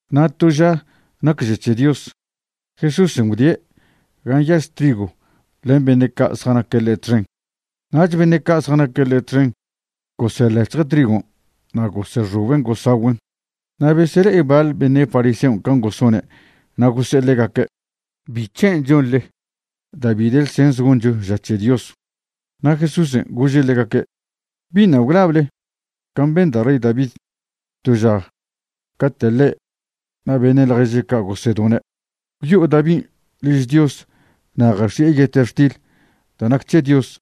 Na' to ža nac ža c̱he Dios, Jesúsen' gwdie' gan' nyaž trigw len beṉe' ca' zjanaque' ḻe' txen. Nach beṉe' ca' zjanaque' ḻe' txen goseḻec̱hje' trigon' na' gosexoben' gosagüen'. Na' besele'e baḻ beṉe' fariseon' can' gosone' na' gose'e ḻegaque': ―¿Bic̱hen' chonḻe da' bi de ḻsens goncho ža c̱he Dios? Na' Jesúsen' gože' ḻegaque': ―¿Biṉa' gwlable can' ben da' rey David to ža cate' ḻe' na' beṉe' ḻježe' ca' gosedone'? Gwyo'o Davin' liž Dios na' jax̱i'e yetextil da' nac c̱he Dios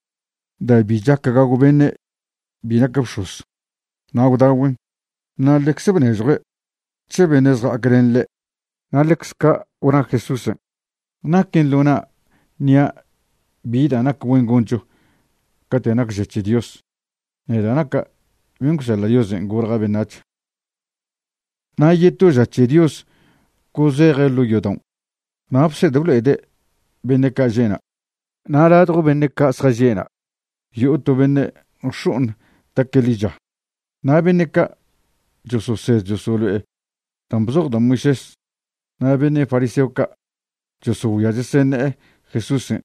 da' bi chac gagw beṉe' bi nac bx̱oz, na' gwdagüen', na' ḻecze bnežjue' c̱he beṉe' zja'ac len ḻe'. Na' ḻecz ca' gwna Jesúsen': ―Naquen ḻo na' ṉia' bi da' nac güen goncho cate' nac ža c̱he Dios, neda' naca' ben' gwseḻa' Diosen' golja' beṉac̱h. Na' yeto ža c̱he Dios gozeje' ḻo' yodaon' na' bsed blo'ede' beṉe' ca' že'na'. Na' ladjo beṉe' ca' zjaže'na' yo'o to beṉe' nx̱o'oṉ taque' ḻicha. Na' beṉe' ca' chososed chosolo'e dan' bzoj da' Moisés na' beṉe' fariseo ca' chosogüia cheseṉe'e Jesúsen'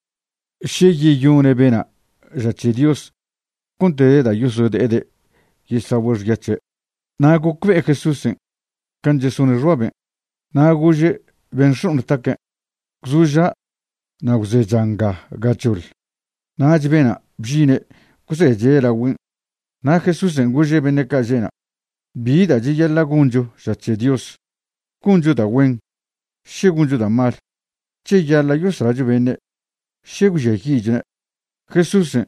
še yeyone' bena' ža c̱he Dios cont de da' yosode'ede' yesagüe' xya c̱he'. Na' gocbe'e Jesúsen' can' chesone' xbaben', na' gože' ben' nx̱o'oṉ taque': ―Gwzoža' na' gwzecha nga gachoḻ. Nach bena' bžine' gwzeche' lagüen'. Na' Jesúsen' gože' beṉe' ca' že'na': ―¿Bi da' cheyaḻa' goncho ža c̱he Dios? ¿Goncho da' güen, še goncho da' mal? ¿Cheyaḻa' yoslacho beṉe', še gwžiayi'chone'? Jesúsen'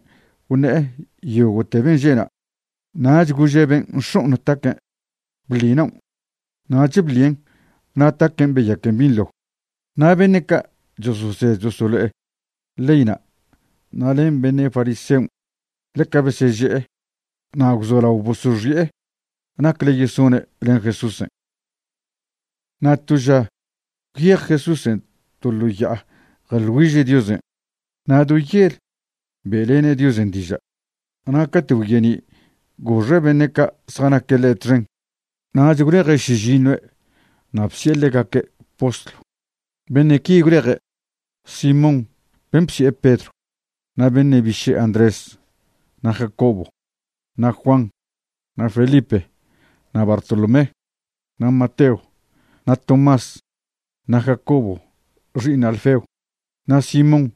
gwṉe'e yogo'te ben' že'na', nach gože' ben' nx̱o'oṉ taque': ―Bḻi naon'. Nach bḻien' na' taquen' beyaquen binḻo. Na' beṉe' ca' chososed chosolo'e leyna' na' len beṉe' fariseon' ḻeca beseže'e na' gwzolao bosoxi'e nacle yesone' len Jesúsen'. Na' to ža gwyej Jesúsen' to ḻo ya'a jeḻ güiže' Diosen'. Na' do yel be'lene' Diosen' diža'. Na' cate' gwye'ni', goxe' beṉe' ca' zjanaque' ḻe' txen, nach gwleje' šižiṉue' na' bsi'e ḻegaque' postlw. Beṉe' qui gwleje': Simón ben' bsi'e Pedro, na' beṉe' biše' Andrés, na' Jacobo, na' Juan, na' Felipe, na' Bartolomé, na' Mateo, na' Tomás, na' Jacobo xi'iṉ Alfeo, na' Simón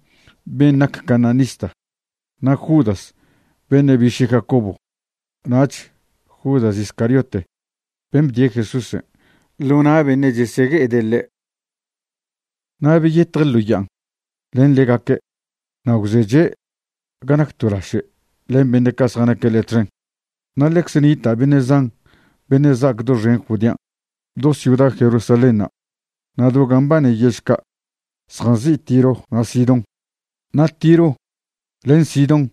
ben nac cananista, na' Judas beṉe' biše' Jacobo, nach Judas Iscariote ben' bdie' Jesúsen' ḻo na' beṉe' chesegue'ede' ḻe'. Na' beyetje' ḻo ya'an len ḻegaque' na' gwzeche' ga nac to laše' len beṉe' ca' zjanaque' ḻe' txen. Na' ḻecze nita' beṉe' zan beṉe' za'ac doxen Judean', do ciuda Jerusalénṉa' na' do gan' mbane yež ca' zjanzi' Tiro na' Sidón. Na' Tiro len Sidón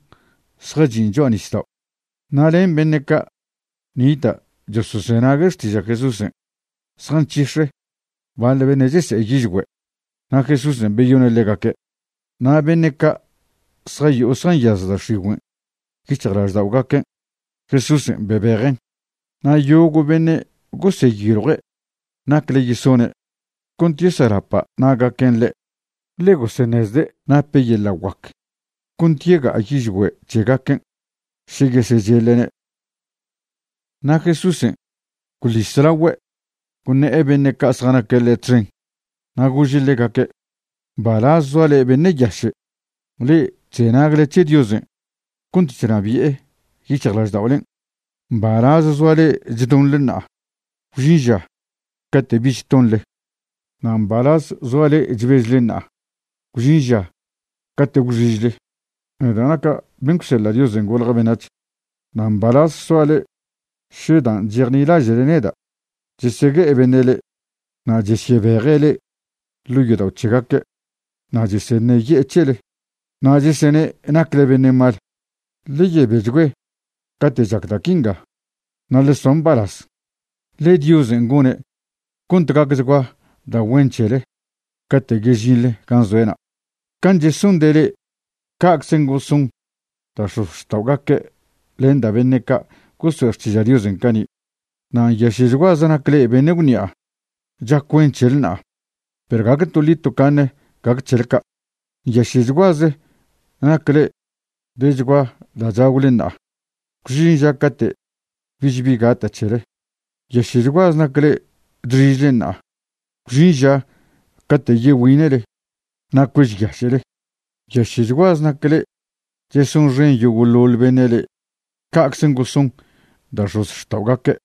zjachin' cho'a nisdao'. Na' len beṉe' ca' nita' chosozenague' xtiža' Jesúsen' zjanc̱hix̱e baḻ beṉe' chese'e yižgüe'. Na' Jesúsen' beyone' ḻegaque'. Na' beṉe' ca' zjayo'o zjanyaz da' x̱igüen' yic̱hjlažda'ogaque', Jesúsen' bebejen'. Na' yogo' beṉe' goseyiljue' nacle yesone' cont yeselapa' na'gaquen' ḻe', ḻe goseṉezde' nape' yeḻa' guac cont yega'a yižgüe' c̱hegaquen' še yesecheḻe'ne'. Na' Jesúsen' gwḻis lagüe' gwṉe'e beṉe' ca' zjanaque' ḻe' txen na' gože' ḻegaque': ―Mbalaz zoa le'e beṉe' yaše', le'e chzenagle c̱he Diosen' cont chnabi'e yic̱hjlažda'olen'. ’Mbalaz zoa le'e chdonḻe ṉa'a, gwžin ža cate' bich tonḻe. ’Na' mbalaz zoa le'e chbežle ṉa'a, gwžin ža cate' gwxižle. ’Neda' naca' ben' gwseḻa' Diosen' golja' beṉac̱h. Na' mbalaz soale še dan' chejnilaže'le neda' chesegue'e beṉe' le'e, na' chesyebeje' le'e ḻo' yodao' c̱hegaque', na' cheseṉeye'e c̱hele, na' chesene' nacle beṉe' mal. Ḻe yebechgüe cate' chac da' quinga, na' ḻe soa mbalaz, ḻe Diosen' gone' cont gacchgua da' güen c̱hele cate' yežinḻe gan' zoe'na'. Can' chesonde' le'e, ca'czen' goson da' x̱ozxta'ogaque' len da' beṉe' ca' goso'e xtiža' Diosen' cani'. ’Na' nyaše'chguaze nac le'e beṉe' gwṉi'a. Chac güen c̱hele ṉa'a, perw gague toḻi tocaṉen' gac c̱hele ca'. ’Nyaše'chguaze nac le'e dechgua da' chagwle ṉa'a. Gwžin ža cate' bich bi gata' c̱hele. ’Nyaše'chguaze nac le'e chxižle ṉa'a. Gwžin ža cate' yegüine'le na' cuežyaše'le. ’Nyaše'chguaze nac le'e chesonxen yogo'ḻoḻ beṉe' le'e. Ca'czen' goson da' x̱ozxta'ogaque',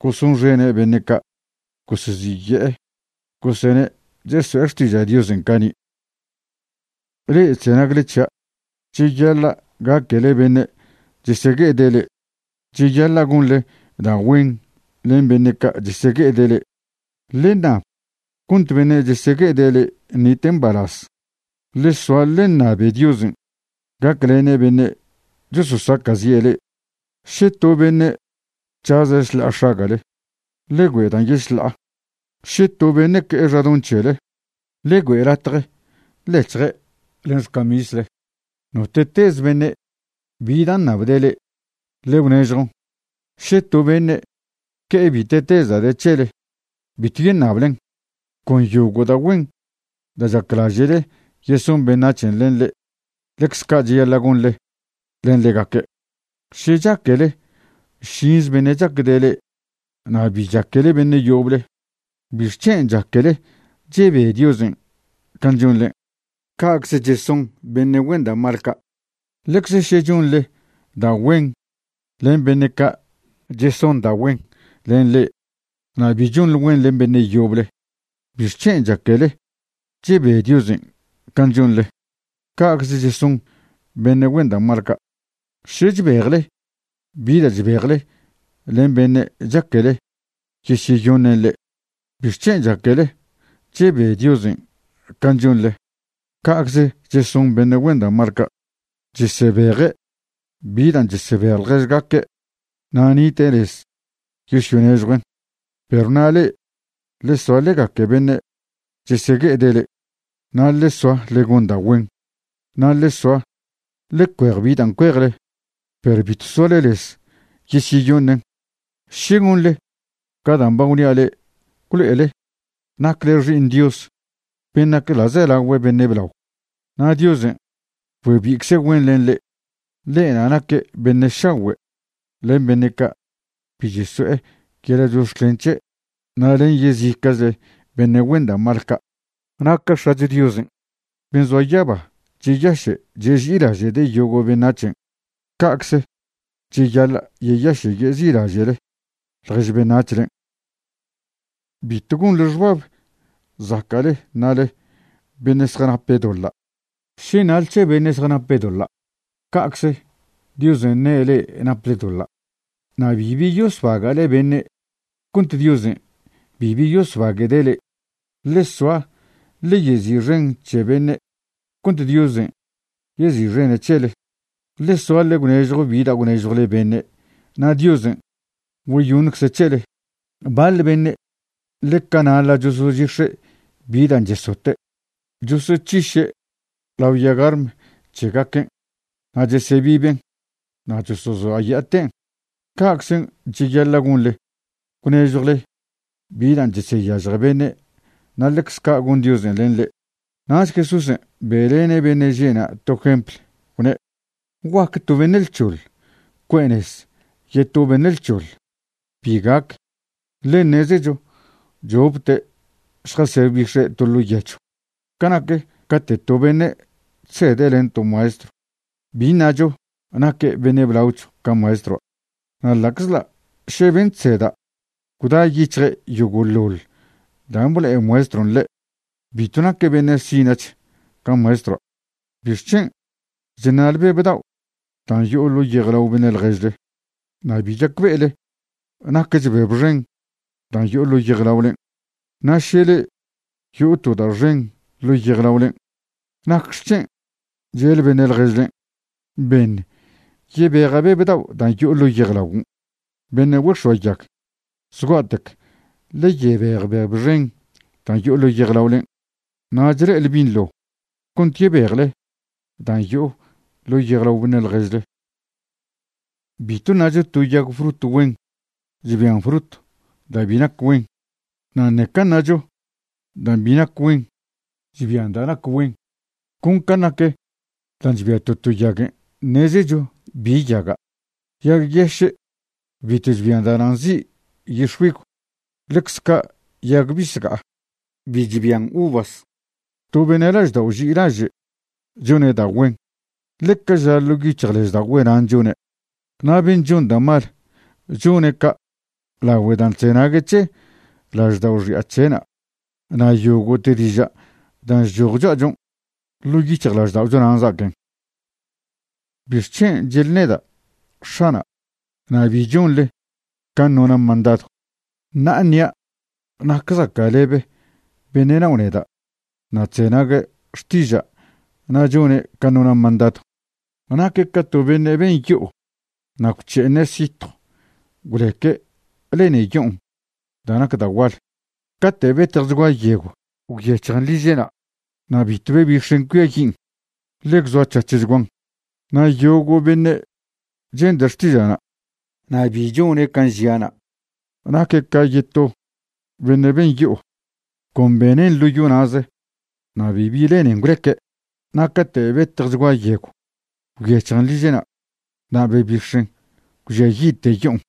gosonxene' beṉe' ca' goseziye'e gosene' cheso'e xtiža' Diosen' cani'. ’Le'e chzenagle c̱hia', cheyaḻa' gaquele beṉe' chesegue'ede' le'e. Cheyaḻa' gonḻe da' güen len beṉe' ca' chesegue'ede' le'e. Ḻe ṉab cont beṉe' chesegue'ede' le'e ṉite' mbalaz. Ḻe soa ḻe ṉabe Diosen' gaclene' beṉe' chososaca'zi' le'e. Še to beṉe' c̱haze' šḻa'a x̱aga'le, ḻe güe' dan' yešḻa'a. Še to beṉe' que'e xadoṉ c̱hele, ḻe güe' latje ḻec̱hje' len xcamisle. Note'teze beṉe' bi dan' ṉabde' le'e, ḻe gwnežjon. Še to beṉe' que'e bite'teze da' de c̱hele, bitw yeṉablen. Con yogo' da' güen da' chaclaže'le yeson beṉac̱hen' len le'e, ḻecze ca' cheyaḻa' gonḻe len ḻegaque'. ’Še chaquele šinze beṉe' chacde' le'e na' bi chaquele beṉe' yoble, ¿bixc̱hen' chaquele chebe Diosen' can' chonḻe? Ca'cze cheson beṉe' güen da' mal ca'. Ḻecze še chonḻe da' güen len beṉe' ca' cheson da' güen len le'e na' bi chonḻe güen len beṉe' yoble, ¿bixc̱hen' chaquele chebe Diosen' can' chonḻe? Ca'cze cheson beṉe' güen da' mal ca'. Še chbejle bi da' chbejle len beṉe' chaquele yesyeyoṉen' le'e, ¿bixc̱hen' chaquele chebe Diosen' can' chonḻe? Ca'cze cheson beṉe' güen da' mal ca', chesebeje' bi dan' chesebej ḻježgaque', na' nite' lez yosyonežjuen'. Perw na' le'e, ḻe soa ḻe gaque beṉe' chesegue'ede' le'e, na' ḻe soa ḻe gon da' güen. Na' ḻe soa ḻe cuej bi dan' cuejle, perw bitw soale lez yesyeyoṉen'. Še gonḻe ca dan' ba gwnia' le'e, gwlo'ele nacle xi'iṉ Dios ben' nac ḻa'zelagüe beṉe' blao, na' Diosen' güebi'icze' güen len le'e. Ḻe'na' naque' beṉe' šagüe' len beṉe' ca' bi cheso'e yeḻa' chox̱clen c̱he' na' len yezica'chle beṉe' güen da' mal ca'. Na' ca X̱acho Diosen' ben' zoa yaba cheyaše' cheži'ilaže'de' yogo' beṉac̱hen', ca'cze cheyaḻa' yeyaše' yeži'ilaže'le ḻjež beṉac̱hlen'. ’Bitw gonḻe xbab zaca'le ṉale beṉe' zjanape' doḻa'. Še ṉale c̱he beṉe' zjanape' doḻa', ca'cze Diosen' ṉe' le'e naple doḻa'. Na' bibi yosbaga'le beṉe' cont Diosen' bibi yosbague'de' le'e. Ḻe soa ḻe yezi'xen c̱he beṉe' cont Diosen' yezi'xene' c̱hele. Ḻe soa ḻe gwnežjo bi da' gwnežjwle beṉe' na' Diosen' güeyoṉcze' c̱hele. Baḻ beṉe' ḻeca naḻa' chosochix̱e' bi dan' chesote', chosoc̱hiše' lao yagarm c̱hegaquen' na' chesebiben' na' chosozoaya'aten'. Ca'czen' cheyaḻa' gonḻe gwnežjwle bi dan' cheseyažje beṉe' na' ḻecz ca' gon Diosen' len le'e. Nach Jesúsen' be'lene' beṉe' že'na' to jempl, gwne': ―¿Guaque to beṉe' lc̱hoḻ cue'e nez yeto beṉe' lc̱hoḻ? Bi gac. Ḻe ṉezecho chopte' šjasebix̱e' to ḻo' yechw. Ca nac cate' to beṉe' chsede' len to maestrw, bi ṉacho naque' beṉe' blaoch ca maestroa'. Na' ḻa'czḻa' še ben' chseda' gwda' yic̱hje' yogo'ḻoḻ dan' blo'e maestron' ḻe', bitw naque' beṉe' sina'ch ca maestroa'. ’¿Bixc̱hen' chṉa'le beb dao' dan' yo'o ḻo' yejlao beṉe' ḻježle, na' bi chacbe'ele naquech beb xen dan' yo'o ḻo' yejlaolen'? Na' še le'e yo'o to da' xen ḻo' yejlaolen' ¿nacxec̱hen' che'le beṉe' ḻježlen': “Beṉ yebeja' beb dao' dan' yo'o ḻo' yejlaguon'”? ¡Beṉe' güex̱oayag! Zgua'tec ḻe yebej beb xen dan' yo'o ḻo' yejlaolen', nach le'ele binḻo cont yebejle dan' yo'o ḻo' yejlao beṉe' ḻježle. ’Bitw ṉacho to yag frut güen chbian frut da' bi nac güen, na' ṉeca ṉacho dan' bi nac güen chbian da' nac güen. Con can' nac da' chbia to to yaguen' ṉezecho bi yaga'. Yag yeše' bitw chbian da'na' nzi' yix̱güigw. Ḻecz ca' yag bisga'a bi chbian uvas. To beṉe' laždao' ži'ilaže' chone' da' güen, ḻe ca ža ḻo' yic̱hjlažda'ogüe' nan' chone'. Na' ben' chon da' mal, chone' ca' lagüe dan' chzenague' c̱he laždao' xi'a c̱he'na'. Na' yogo'te diža' dan' chchoj cho'achon', ḻo' yic̱hjlažda'ocho nan' za'aquen. ’¿Bic̱hen' che'le neda': “X̱ana'”, na' bi chonle can' nona' mandadw? Ṉa'a ṉia' nac zaca'lebe beṉe' nao' neda' na' chzenague' xtiža' na' chone' can' nona' mandadw. Naque' ca to beṉe' ben yo'o na' gwc̱he'eṉe' sitjw gwleque' lene yo'on da' nac da' gual. Cate' betjchgua yegw gwyec̱hjen liže'na', na' bitw bebix̱en cuiayin', ḻe gwzoac̱hac̱hchguan. Na' yogo' beṉe' chende' xtiža'na' na' bi chone' can' žia'na' naque' ca yeto beṉe' ben yo'o, con benen' ḻo yo na'ze na' bibi lenen gwleque'. Na' cate' betjchgua yegw gwyec̱hjen liže'na', na' bebix̱en gwžiayi'te yo'on.